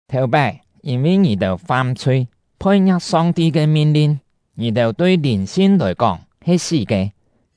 Thèu-pái, yîn-vi ngì-têu fam-chhui, phoi-ngia̍k Song-ti ke min-lin, ngì-têu tui lìn-sin lòi kóng he sí ke.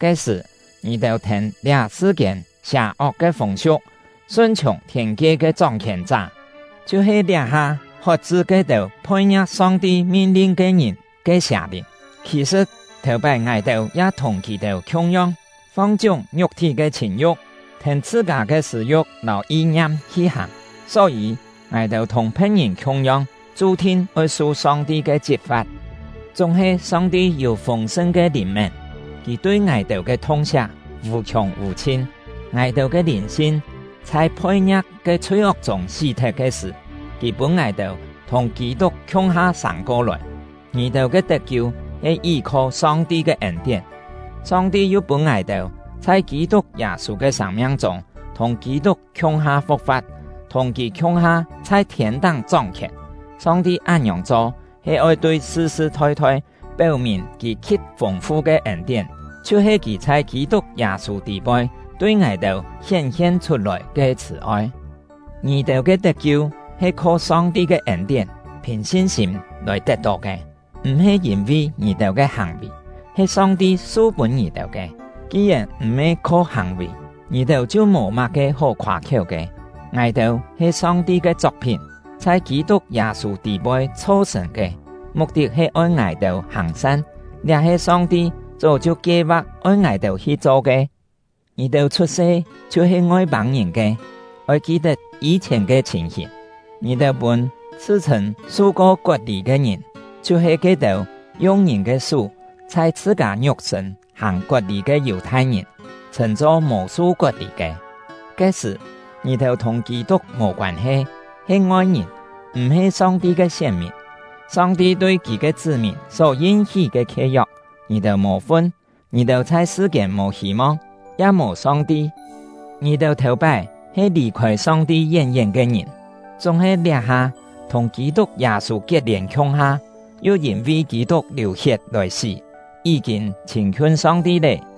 Ke-sṳ̀, ngì-têu thèn liá sṳ-kiên sià-ok ke fûng-siu̍k, sun-chhiùng thiên-kie ke chóng-khièn-chá, chhiu-he liá-ha hot-chṳ ke-têu phoi-ngia̍k Song-ti min-lin ke ngìn ke sià-lìn. Khì-sṳ̍t, thèu-pái ngài-têu ya thùng kì-têu khiung-yong, fong-chiúng ngiuk-thí ke chhìn-yu̍k, thèn chhṳ-kâ ke sṳ̂-yu̍k lâu yi-ngiam hi hàng. Só-yî, ngài-têu thùng phe̍t-ngìn khiung-yong, chu-thin oi su Song-ti ke chit-fa̍t. Chúng-he Song-ti yû fûng-sṳn ke lìn-mén; Kì tui ngài-têu ke thung-siak vù-khiùng vù-chhin. Ngài-têu ke lìn-sin chhai phoi-ngia̍k ke chhui-ok chûng sí-thet ke sṳ̀, Kì pûn ngài-têu thùng Kî-tuk khiung-ha sâng-ko-lòi; ngì-têu ke tet-kiu he yí-kho Song-ti ke ên-tién. Song-ti yu pûn ngài-têu chhai Kî-tuk Yâ-sû ke sâng-miang chûng thùng Kî-tuk khiung-ha fu̍k-fa̍t, thùng kì khiung-ha chhai thiên-táng chóng-khièn. Song-ti án-ngiòng cho he oi tui sṳ-sṳ thoi-thoi péu-mìn Kì khi̍t fûng-fu ke ên-tién, chhiu-he Kì chhai Kî-tuk Yâ-sû tî-poi tui ngài-têu hién-hien chhut-lòi ke chhṳ̀-oi. Ngì-têu ke tet-kiu he kho Song-ti ke ên-tién, phìn sin-sîm lòi tet-tó ke; m̀-he yîn-vi ngì-têu ke hàng-vì, he Song-ti su-pûn ngì-têu ke. Ki-yèn m̀-he kho hàng-vì, ngì-têu chhiu mò má-ke hó khoâ-khiéu ke. Ngài-têu he Song-ti ke chok-phín, chhai Kî-tuk Yâ-sû tî-poi chho-sṳ̀n ke, muk-tit he oi ngài-têu hàng-san; liá he Song-ti chó chhiu kie-va̍k oi ngài-têu hi-cho ke. Ngì-têu chhut-se chhiu-he Ngoi-pâng-ngìn ke, oi ki-tet yî-chhièn ke chhìn-hìn: Ngì-têu pûn chhṳ-chhṳ̂n su-ko kot-lî ke ngìn — chhiu-he ke-têu yung ngìn ke sú chhai chhṳ-kâ ngiuk-sṳ̂n hàng kot-lî ke Yù-thai-ngìn — chhṳ̂n-cho mò su kot-lî ke. Ke-sṳ̀, ngì-têu thùng Kî-tuk mò koân-he, he ngoi-ngìn, m̀-he Song-ti ke sién-mìn. Song-ti tui Kì ke chṳ́-mìn só yin-hí ke khie-yok, ngì-têu mò fun; ngì-têu chhai sṳ-kiên mò hî-mong, ya mò Song-ti. Ngì-têu thèu-pái he lì-khôi Song-ti yén-yén ke ngìn, chúng-he liá-ha thùng Kî-tuk Yâ-sû kiet-lièn khiung-ha, yu yîn-vi Kî-tuk liù-hiet lòi sí, yí-kîn chhîn-khiun Song-ti lé.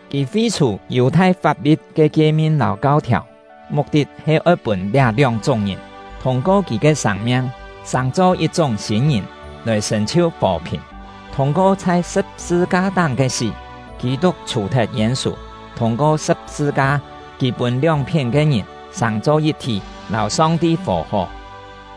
Kì fi-chhù Yù-thai fap-li̍t ke kie-min lâu kau-thiàu, muk-tit he oi pûn liá lióng-chúng ngìn thûng-ko kì ke sâng-miang sàng-cho yit-chúng sîn-ngìn, lòi sṳ̀n-chhiu fò-phìn. Thûng-ko chhai sṳ̍p-sṳ-ka-táng ke sí, Kî-tuk chhù-thet yên-sù; thûng-ko sṳ̍p-sṳ-ka, kì pûn lióng-phién ke ngìn sàng-cho yit-thí, lâu Song-ti fò-hó.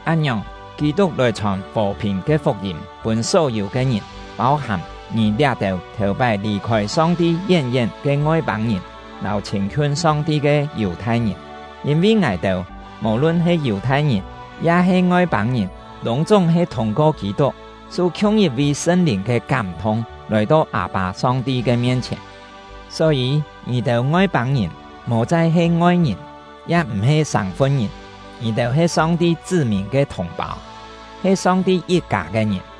Án-ngiòng, Kî-tuk lòi chhòn fò-phìn ke fuk-yîm pûn só-yû ke ngìn, pâu-hàm ngì liá-têu thèu-pái lì-khôi Song-ti yén-yén ke Ngoi-pâng-ngìn lâu chhîn-khiun Song-ti ke Yù-thai-ngìn. Yîn-vi ngài-têu mò-lun he Yù-thai-ngìn ya-he Ngoi-pâng-ngìn, lûng-chúng he thûng-ko Kî-tuk, su khiung yit-vi Sṳn-Lìn ke kám-thung, lòi-to Â-pâ Song-ti ke mien-chhièn. Só-yî, ngì-têu Ngoi-pâng-ngìn mò chai he ngoi-ngìn, ya m̀-he sâng-fun-ngìn; ngì-têu he Song-ti chṳ́-mìn ke thùng-pâu, he Song-ti yit-kâ ke ngìn.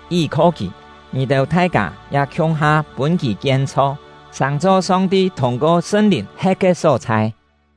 Yí-kho kì, ngì-têu thai-kâ ya khiung-ha pûn kì kien-chho, sàng-cho Song-ti thûng-ko Sṳn-Lìn he̍t ke só-chhai.